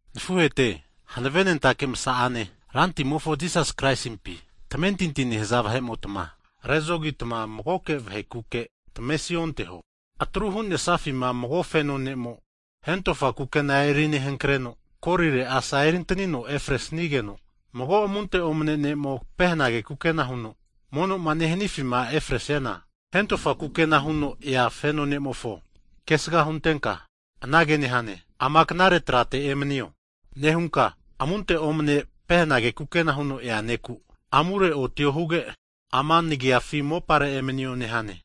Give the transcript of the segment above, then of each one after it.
Nafuhete, hanavenentake msa'ane Rantimofo Jisasi Kraisimpi tamentinti nehaza vahe'motma, rezogitma mago vahekuke tamavesi onteho. Atru hu'nesafima mago feno ne'mo hentofa kukena erinehankreno, korire asa eri'nentanino efresnigeno, mago amunte omane ne'mo pehenage kukena huno monoma nehanafima efresiana, hentofa kukena huno ea feno ne'mofo kesga huntenka anage nehane, ama knare trate emanio nehunka, amunte omane pehenage kukena huno ea ne'ku, amure otio huge ama nagafi mopare emanio nehane.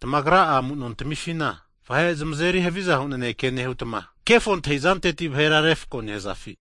Tamagra'a amu'nontamifina vahe zmazeri havizahu naneke nehutma, kefo antahizanteti vahera refako nehazafi?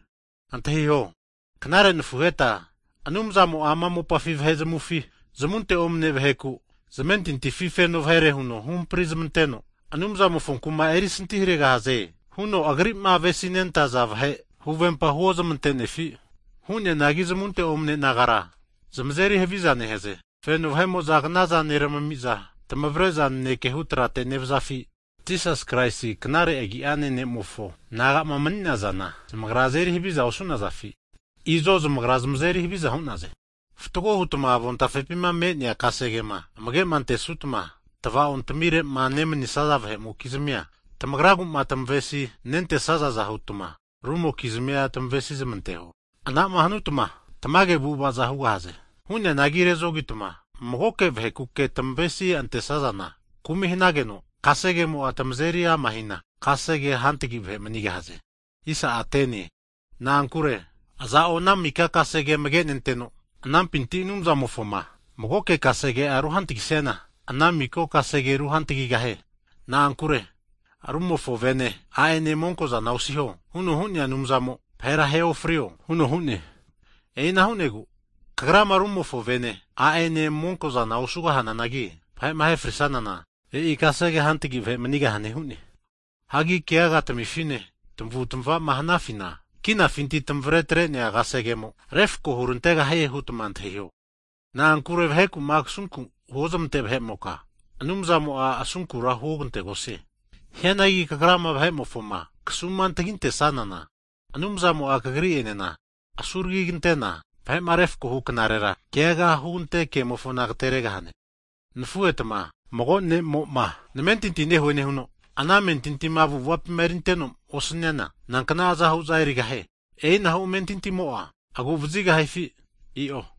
Antahiho, knare nafuheta, Anumzamo'a ama mopafi vahe zamavufi zamunte omane vaheku' zamentintifi feno vahere huno huhampri zamanteno, Anumzamofo kuma erisanti haregahaze huno Agri'ma avesinentaza vahe huvempa huozmante'nefi? Hu'neanagi zamunte omane nagara zmazeri haviza nehaze. Feno vahe'mo'za knaza neramami'za, tmavare'za naneke hu tratera nevazafi? Jisasi Kraisi knare agi'ane Ne'mofo nagama mni'nazana, zamagra zmazeri haviza osu'nazafi? Izo zmagra zmazeri haviza hu'naze. Fatgo hutma avontafepima me'nea kasegema amage'antesnutma, tvaontamire'ma nemanisaza vahe'mokizmia tamagraguma tamavesi nentesazaza hutma rumokizmia tamavesi zmanteho, anama hanutma tamage avu'avaza hugahaze. Hu'neanagi rezogitma mago vahekuke tamavesi antesazana, kumi hanageno kasegemo'a tamazeri ama'hina, kasegea hantagi vahe manigahaze. Na'ankure, aza'o ana mika kasege amage'nenteno, anampinti Anumzamofoma magoke kasege'a ruhantagisiana, ana mika kasege ruhantagigahie. Na'ankure rumofo vene, a'ene monko'zana osiho huno hu'nea Anumzamo vahera ahe ofriho huno hu'ne. E'ina hu'negu kagrama rumofo vene, a'ene monko'zana osugahananagi, vahe'ma ahe frisazana e'i kasege hantagi vahe manigahane hu'ne. Hagi keaga tamifine, tamavu'tamava hanafina, kinafinti tamavre atre'nea kasegemo refako hurantegahie hutma antahiho. Na'ankure vaheku'ma kasunku huozmante vahe'moka, Anumzamo'a asunkura huogantegosie. Hianagi kagrama vahe'mofoma kasumantagintesanana, Anumzamo'a kagri'enena asuragigante'na vahe'ma refko huknarera, keaga hugante kemofona agateregahane. Nafuhetma, mago ne'mo'ma namentinti nehue nehuno, ana amentintima avu'avapima erinteno osaniana nankna azahu'za erigahie? E'inahu amentintimo'a aguvazigahifi? I'o.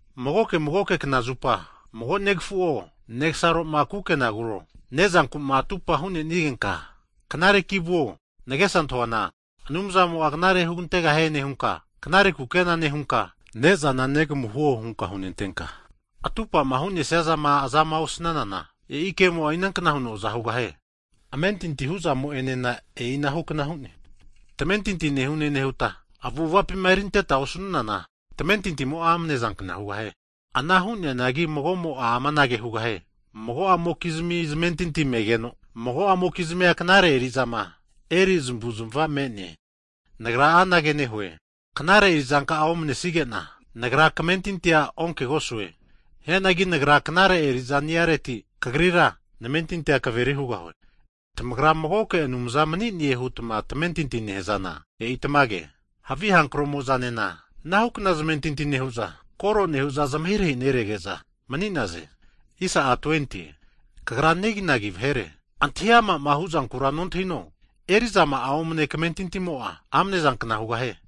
Magoke magoke knazupa mago negafu'o, negasaroma kukenaguro, ne'zankuma atupa hu'nenigenka, knareki vuo nagesa antahuana Anumzamo'a knare hugantegahie nehunka, knare kukena nehunka ne'zana negamu huo hunka hunentenka, atupama hunesiazama azama osnanana, e'i kemo'a inankna huno aza hugahie? Amentinti hu'zamo'enena e'inahu kna hu'ne, tamentinti nehune nehuta, avu'avapima erinteta osanunana, tamentintimo'a amne'zankna hugahie. Ana hu'neanagi mago'mo'a anage hugahie, mago'amokizmi zamentinti me'geno, mago'amokizmia knare erizama eri zamavuzamava me'ne. Nagra anage nehue, knare erizanka'a omnesigena, nagra kamentintia onkegosue. Hianagi nagra knare eri'za niareti kagrira, namentintini'a kaveri hugahue. Tamagra magoke Anumza mani'ne hutma tamentinti nehazana, e'i tamage, havi hankro'mo'zanena anahukna zamentinti nehu'za, kore nehu'za zamahirahi nerege'za mani'naze. Kagra negi nagi vahere! Antahi ama'ma huzankura nontahino, eri'zama'a omane kamentintimo'a amnezankna hugahie.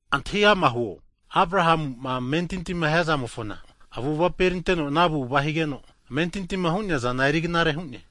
Antahi ama huo, Abrahamu'ma amentintima hiazamofona avu'avapi erinteno, ana avu'ava higeno amentintima hu'neazana erignare hu'ne.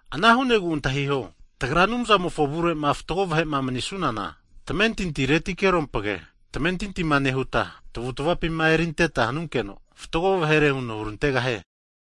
Ana hu'negu antahiho, tagra Anumzamofo avure'ma fatgo vahe'ma manisunana, tamentinti'retikerompage, tamentintima nehuta tavutavapima erinteta hanunkeno, fatgo vahere huno hurantegahie.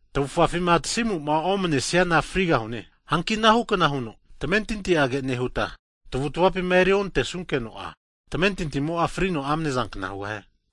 Tavufafima tasimu'ma omanesiana frigahune. Hanki anahu'kna huno tamentinti'age nehuta, tavutavapima eriontesunkeno'a, tamentintimo'a frino amne'zankna hugahie.